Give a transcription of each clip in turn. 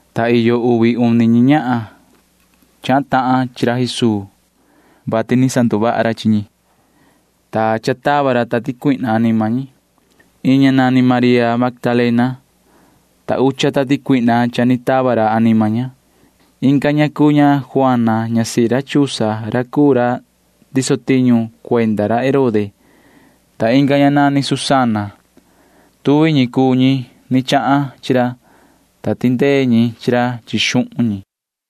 ta iyo uvi uni ñi ñahan chahan tahan chi ra Jesuu, vati cha ni sanduvaha ra chi ñi, ta cha tava ra tati cuihna anima ñi. Iin ña nani María Magdalena, ta ucha tati cuihna cha ni tava ra anima ña. Inga ña cuu ña Juana ñasihi ra Chuza ra cuu ra ndiso tiñu cuenda ra Herode, ta inga ña nani Susana. Tuvi ñi cuu ñi ni chahan chi ra, ta tindee ñi chi ra chi xuhun ñi.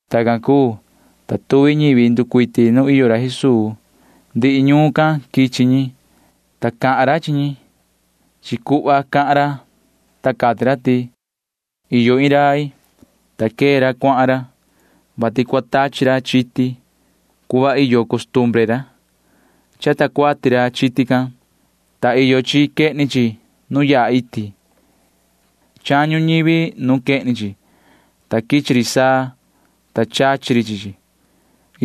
Tacan cuu, ta tuvi ñivi nducuiti nu iyo ra Jesuu. Ndihi ñuun can quichi ñi, ta cahan ra chi ñi. Chi cuhva cahan ra, ta cati ra ti: ―Iyo iin rai, ta quee ra cuahan ra, vati cua tachi ra chiti [cuhva iyo costumbre ra]. Chata cuati ra chiti can, ta iyo chi quehni chi nu yaha iti. Chañu ñivi nuun quehni chi, ta quichi ri saa, ta chachi ri chi chi.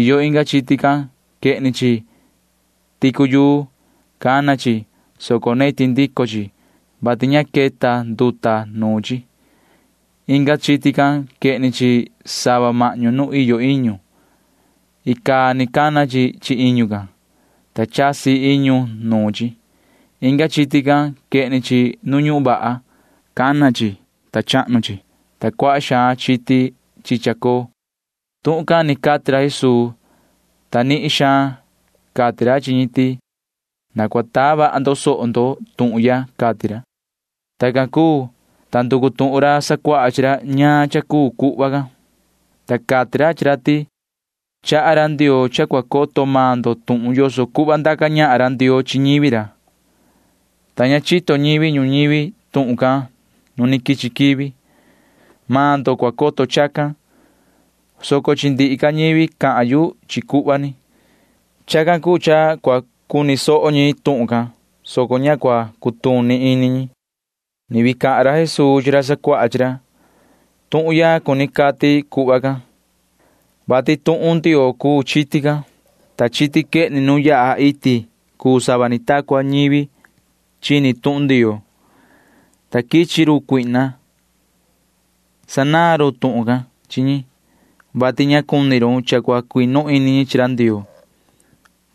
Iyo inga chiti can―quehni chi ticu yuu. Cana chi, soco neti ndico chi, vati ña queta nduta nuun chi. Inga chiti can―quehni chi sava mahñu nu iyo iñu. Icaa ni cana chi chi iñu can, ta chasi iñu nuun chi. Inga chiti can―quehni chi nu ñuhun vaha. Cana chi. Chahnu chi, ta cuaha xaan chiti chi chacoo. Tuhun can ni cati ra Jesuu, ta nihin xaan cati ra chi ñi ti: ―Na cua taa vaha ndo soho ndo tuhun ya ―cati ra. Tuhun cha cuu cuhva can ―Chaha ra Ndioo cha cua coto maan ndo tuhun yoso cuhva ndaca ñahan ra Ndioo chi ñivi ra, ta ña chito ñivi ñuñivi tuhun can nu ni quichi quivi. Maan ndo cua coto chacan, soco chi ndihi ca ñivi cahan yu chi cuhva ni. Chacan cuu cha cua cuni soho ñi tuhun can, soco ña cua cutuni ini ñi. [Ni vii cahan ra Jesuu chi ra sacuaha chi ra:] ’Tuhun ya cuni cati cuhva can, vati tuhun Ndioo cuu chiti can, ta chiti quehni nu yaha iti cuu sava ni ta cua ñivi chini tuhun Ndioo, ta quichi run cuihna. Sanaan run tuhun can chi ñi, vati ña cuni run cha cua cuinu ini ñi chi ra Ndioo,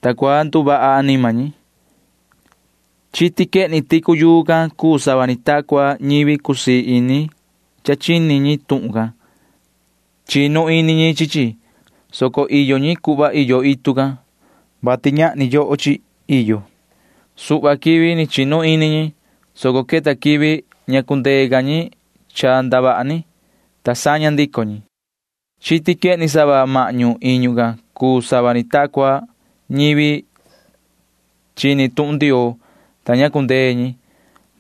ta cua nduvaha anima ñi. Chiti quehni ticu yuu can cuu sava ni ta cua ñivi cusii ini cha chini ñi tuhun can. Chinu ini ñi chi chi, soco iyo ñi cuhva iyo itu can, vati ñahni yoho chi iyo. Suhva quivi ni chinu ini ñi, soco queta quivi ña cundee ca ñi cha ndavaha ni, ta saña ndico ñi. Chiti quehni sava mahñu iñu can cuu sava ni ta cua ñivi chini tuhun Ndioo, ta ña cundee ñi,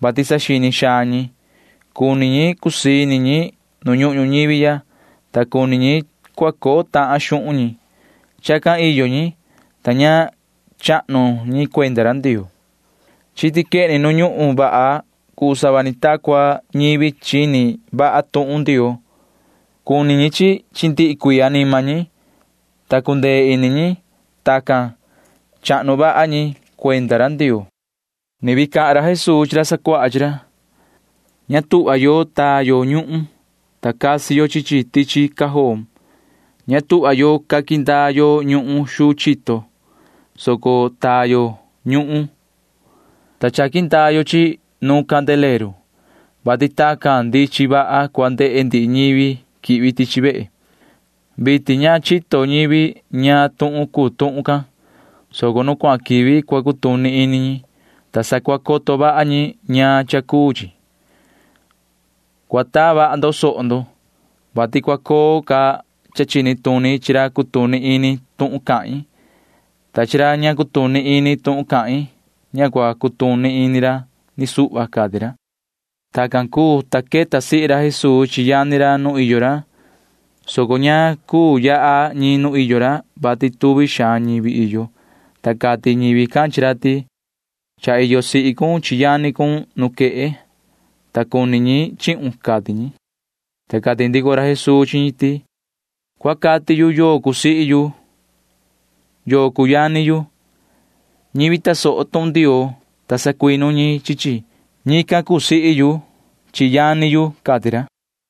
vati saxini xaan ñi. Cuni ñi cusii ini ñi nu ñuhun ñuñivi, ta cuni ñi cha cua coo tahan xuhun ñi. Chacan iyo ñi, ta ña chahnu ñi cuenda ra Ndioo. Chiti quehni nu ñuhun vaha cuu sava ni ta cua ñivi chini vaha tuhun Ndioo. Cuni ñi chi chi chi ndihi cuii anima ñi, ta cundee ini ñi. Tacan chahnu vaha ñi cuenda ra Ndioo. [Ni vii cahan ra Jesuu chi ra sacuaha chi ra:] ’Ña tuhva yo taa yo ñuhun, ta casi yo chi chi tichi cajoon. Ña tuhva yo caqui ndaa yo ñuhun xuu chito, soco taa yo ñuhun, ta chaqui ndaa yo chi chi nu candileru, vati tacan ndichin vaha cua ndehe ndihi ñivi quihvi tichi vehe. Vitin ña chito ñivi ñaan tuhun cuu tuhun can, soco nu cuahan quivi cua cutuni ini ñi, ta sa cua coto vaha ñi ñaan cha cuu chi. ’Cua taa vaha ndo soho ndo, vati cua coo ca cha chini tuni chi ra cutuni ini tuhun cahin, ta chi ra ña cutuni ini tuhun cahin―ña cua cutuni ini ra ni suhva ―cati ra. Tacan cuu, ta queta sihi ra Jesuu chi yani ra nu iyo ra, soco ña cuu yaha ñi nu iyo ra, vati tuvi xaan ñivi iyo, ta cati ñivi can chi ra ti: ―Cha iyo sihi cun chi yani cun nuquehe, ta cuni ñi chihun ―cati ñi. Ta cati ndico ra Jesuu chi ñi ti: ―Cua cati yu yoo cuu sihi yu yoo cuu yani yu. Ñivi tasoho tuhun Ndioo, ta sacuinu ñi chi chi―ñican cuu sihi yu chi yani yu ―cati ra.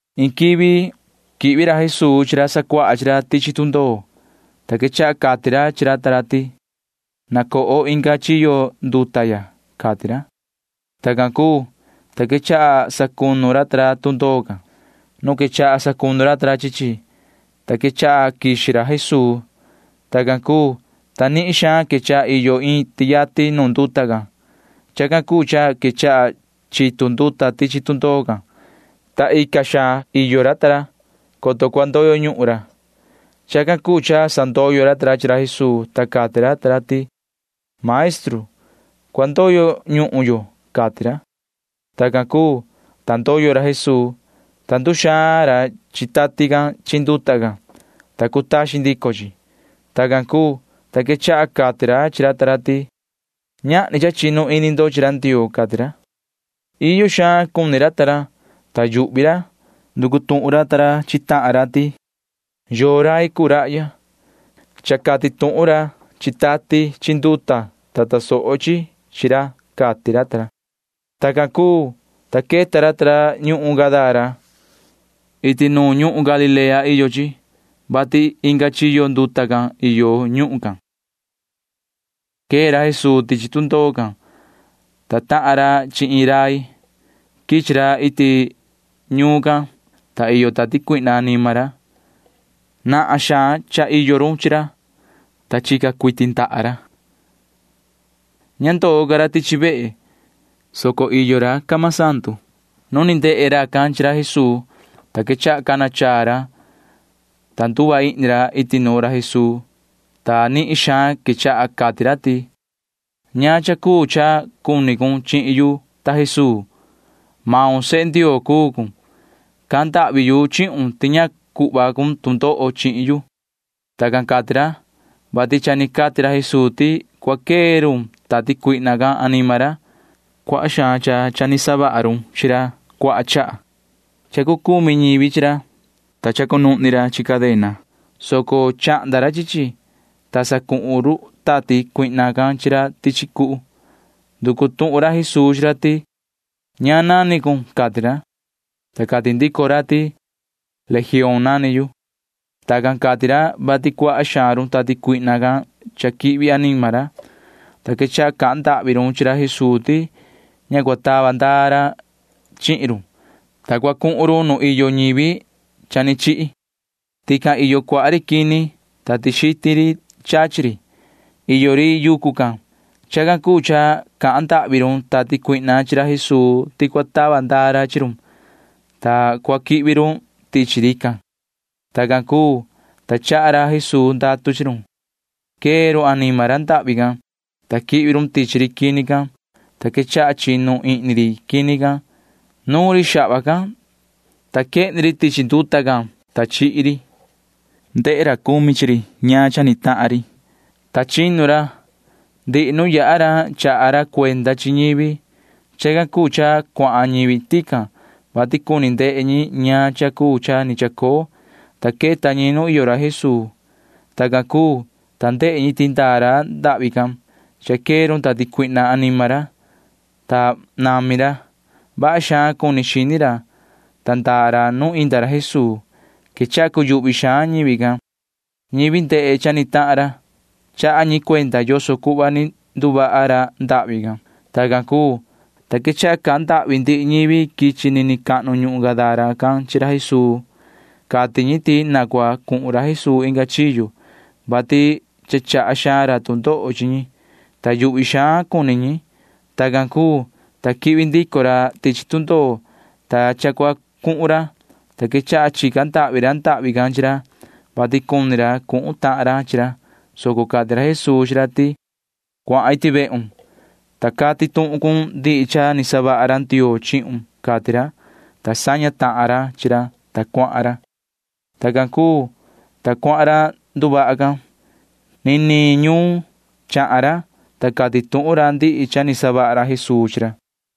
Iin quivi quihvi ra Jesuu chi ra sacuaha chi ra tichi tundoo, ta quechaha cati ra chi ra ta ra ti: ―Na coho inga chiyo nduta ya ―cati ra. Tacan cuu, ta quechaha sacunu ra ta ra tundoo can. Nu quechaha sacunu ra ta ra chi chi, ta quechaha quixi ra Jesuu. Tacan cuu, ta nihin xaan quechaha iyo iin tiati nu nduta can. Chacan cuu cha quechaha chitu nduta tichi tundoo can, ta ica xaan suhva iyo ra ta ra, coto cua ndoyo ñuhun ra. Chacan cuu cha sandoyo ra ta ra chi ra Jesuu, ta cati ra ta ra ti: ―¡Maestru, cua ndoyo ñuhun yo! ―cati ra. Tacan cuu, ta ndoyo ra Jesuu, ta nduxaan ra chi tati can chi nduta can, ta cutaxin ndico chi. Tacan cuu, ta quechaha cati ra chi ra ta ra ti: ―Ñahni cha chinu ini ndo chi ra Ndioo ―cati ra. Iyo xaan cuni ra ta ra, ta yuhvi ra. Nducu tuhun ra ta ra chi tahan ra ti: ―¿Yoo rai cuu rahya? Cha cati tuhun ra chi tati chi nduta, ta tasoho chi chi ra ―cati ra ta ra. Tacan cuu, ta queta ra ta ra ñuhun Gadara. Iti nuun ñuhun Galilea iyo chi, vati inga chiyo nduta can iyo ñuhun can. Quee ra Jesuu tichi tundoo can, ta tahan ra chi iin rai. Quichi ra iti ñuun can, ta iyo tati cuihna anima ra. Nahan xaan cha iyo run chi ra, ta chica cuiti ndaha ra. Ña ndoo ca ra tichi vehe, soco iyo ra camasandu. Nu ni ndehe racan chi ra Jesuu, ta quechaha cana chaa ra, ta nduva ihni ra iti nuun ra Jesuu, ta nihin xaan quechaha cati ra ti: ―¿Ñaan cha cuu cha cuni cun chihin yu, ta Jesuu? Yoho―sehe Ndioo cuu cun. Cahan ndahvi yu chihun ti ña cuhva cun tu ndoho chihin yu. Tacan cati ra, vati cha ni cati ra Jesuu ti cua quee run tati cuihna can anima ra. Cuaha xaan cha ni savaha run chi ra cuaha chaha. Cha cucumi ñivi chi ra, ta cha ni cunuhni ra chi cadena caa, soco chahnda ra chi chi, ta sacuhun run tati cuihna can chi ra tichi cuhu. Nducu tuhun ra Jesuu chi ra ti: ―¿Ñaan nani cun? ―cati ra. Ta cati ndico ra ti: ―Legioon nani yu. Tacan cati ra, vati cuaha xaan run tati cuihna can cha quihvi anima ra, ta quechaha cahan ndahvi run chi ra Jesuu ti ña cua tava ndaa ra chi run, ta cua cuhun run nu iyo ñivi cha ni chihi. Tican iyo cuaha ri quini, ta tixitin ri chachi ri iyo ri yucu can. Chacan cuu cha cahan ndahvi run tati cuihna chi ra Jesuu ti cua tava ndaa ra chi run, ta cua quihvi run tichi rican. Tacan cuu, ta chaha ra Jesuu ndatu chi run. Quee run anima ra ndahvi can, ta quihvi run tichi ri quini can, ta quechaha chinu ihni ri quini can. Nuun ri xahva can, ta quehni ri tichi nduta can, ta chihi ri. Ndehe ra cumi chi ri ñaan cha ni tahan ri, ta chinu ra. Ndihi nu yaha ra chaha ra cuenda chi ñivi. Chacan cuu cha cuahan ñivi tican, vati cuni ndehe ñi ñaan cha cuu cha ni chacoo, ta queta ñi nu iyo ra Jesuu. Tacan cuu, ta ndehe ñi ti ndaa ra ndahvi can. Cha quee run tati cuihna anima ra, ta nami ra. Vaha xaan cuni xini ra, ta ndaa ra nu inda ra Jesuu. Quechaha cuyuhvi xaan ñivi can. Ñivi ndehe cha ni tahan ra―chaha ñi cuenda yoso cuhva ni nduvaha ra ndahvi can. Tacan cuu, ta quechaha cahan ndahvi ndihi ñivi quichi nini cahnu ñuhun Gadara can chi ra Jesuu. Cati ñi ti na cua cuhun ra Jesuu inga chiyo, vati cha chaha xaan ra tu ndoho chi ñi, ta yuhvi xaan cuni ñi. Tacan cuu, ta quihvi ndico ra tichi tundoo, ta cha cua cuhun ra, ta quechaha chica ndahvi ra ndahvi can chi ra, vati cuni ra cuhun tahan ra chi ra, soco cati ra Jesuu chi ra ti: ―Cuahan iti vehun, ta cati tuhun cun ndihi cha ni savaha ra Ndioo chihun ―cati ra, ta saña tahan ra chi ra, ta cuahan ra. Tacan cuu, ta cuahan ra nduvaha can. Nini ñuun chahan ra, ta cati tuhun ra ndihi cha ni savaha ra Jesuu chi ra.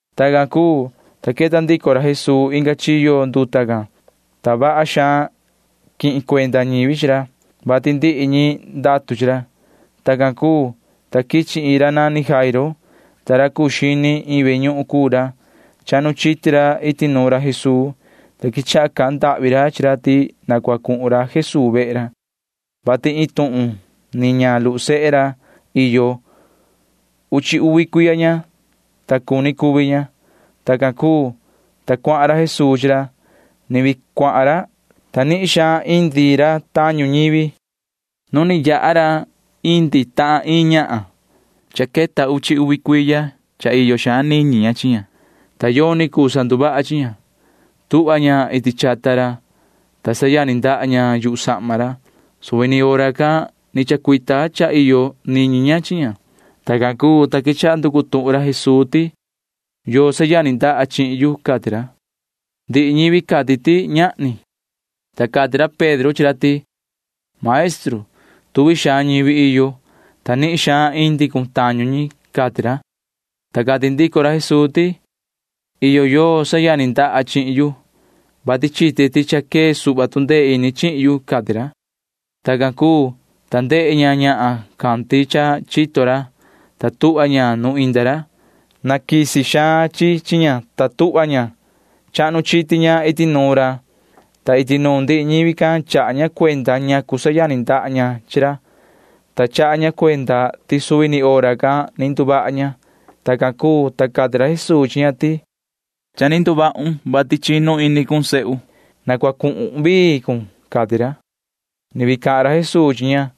Tacan cuu, ta queta ndico ra Jesuu inga chiyo nduta can, ta vaha xaan quihin cuenda ñivi chi ra, vati ndihi ñi ndatu chi ra. Tacan cuu, ta quichi iin ra nani Jairo, ta ra cuu xini iin ve ñuhun cuu ra. Chahnu chiti ra iti nuun ra Jesuu, ta quechaha cahan ndahvi ra chi ra ti na cua cuhun ra Jesuu vehe ra, vati iin tuhun ni ña luhu sehe ra iyo. Uchi uvi cuiya ña, ta cuni cuvi ña. Tacan cuu, ta cuahan ra Jesuu chi ra. Ni vii cuahan ra, ta nihin xaan indi ra tañu ñivi. Nu ni yaha ra indi tahan iin ñahan. Cha queta uchi uvi cuiya iyo xaan niñi ña chi ña, ta yoni cuu sanduvaha chi ña. Tuhva ña iti chata ra, ta sayani ndaha ña yuhu sahma ra. Suvi ni hora can ni chacuita cha iyo niñi ña chi ña. Tacan cuu, ta quechaha nducu tuhun ra Jesuu ti: ―¿Yoo sayani ndaha chihin yu? ―cati ra. Ndihi ñivi cati ti ñahni, ta cati ra Pedro chi ra ti: ―Maestru, tuvi xaan ñivi iyo, ta nihin xaan indi cun tañu ñi ―cati ra. Ta cati ndico ra Jesuu ti: ―Iyo yoo sayani ndaha chihin yu, vati chite ti cha quee suhva tu ndee ini chihin yu ―cati ra. Tacan cuu, ta ndehe ña ñahan can ti cha chito ra, ta tuhva ña nu inda ra. Naquisi xaan chi chi ña, ta tuhva ña. Chahnu chiti ña iti nuun ra, ta iti nuun ndihi ñivi can chaha ña cuenda ñacu sayani ndaha ña chi ra, ta chaha ña cuenda ti suvi ni hora can ni nduvaha ña. Tacan cuu, ta cati ra Jesuu chi ña ti: ―Cha ni nduvahun, vati chinu ini cun, sihi. Na cua cuhun vii cun ―cati ra. Ni vii cahan ra Jesuu chi ña,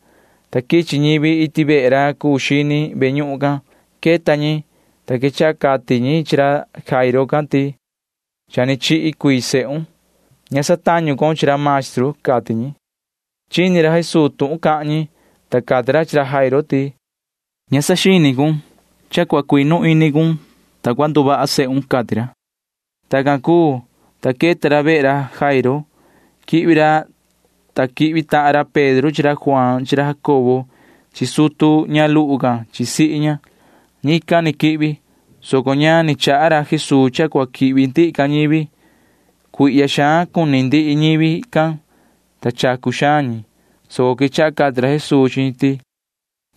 ta quichi ñivi iti vehe ra cuu xini ve ñuhun can. Queta ñi, ta quechaha cati ñi chi ra Jairo can ti: ―Cha ni chihi cuii sehun. Ña satañu con chi ra maestru ―cati ñi. Chini ra Jesuu tuhun cahan ñi, ta cati ra chi ra Jairo ti: ―Ña tichaha ni cun. Mani cha cua cuinu ini cun, ta cua nduvaha sehun ―cati ra. Tacan cuu, ta queta ra vehe ra Jairo. Quihvi ra, ta quihvi tahan ra Pedro chi ra Juaan chi ra Jacobo chi sutu ña luhu can chi sihi ña. Ñican ni quihvi, soco ña ni chaha ra Jesuu cha cua quihvi ndihi ca ñivi. Cuihya xaan cuni ndihi ñivi can, ta chacu xaan ñi, soco quechaha cati ra Jesuu chi ñi ti: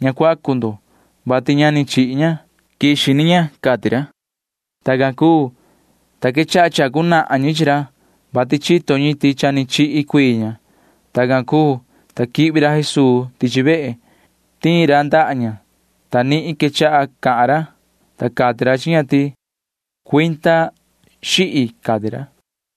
―Ña cuacu ndo, vati ña ni chihi ña. Quixi ni maan ña ―cati ra. Tacan cuu, ta quechaha chacu nahan ñi chi ra; vati chito ñi ti cha ni chihi cuii ña. Tacan cuu, ta quihvi ra Jesuu tichi vehe. Tiin ra ndaha ña, ta nihin quechaha cahan ra, ta cati ra chi ña ti: ―Cuinda, lia ―cati ra.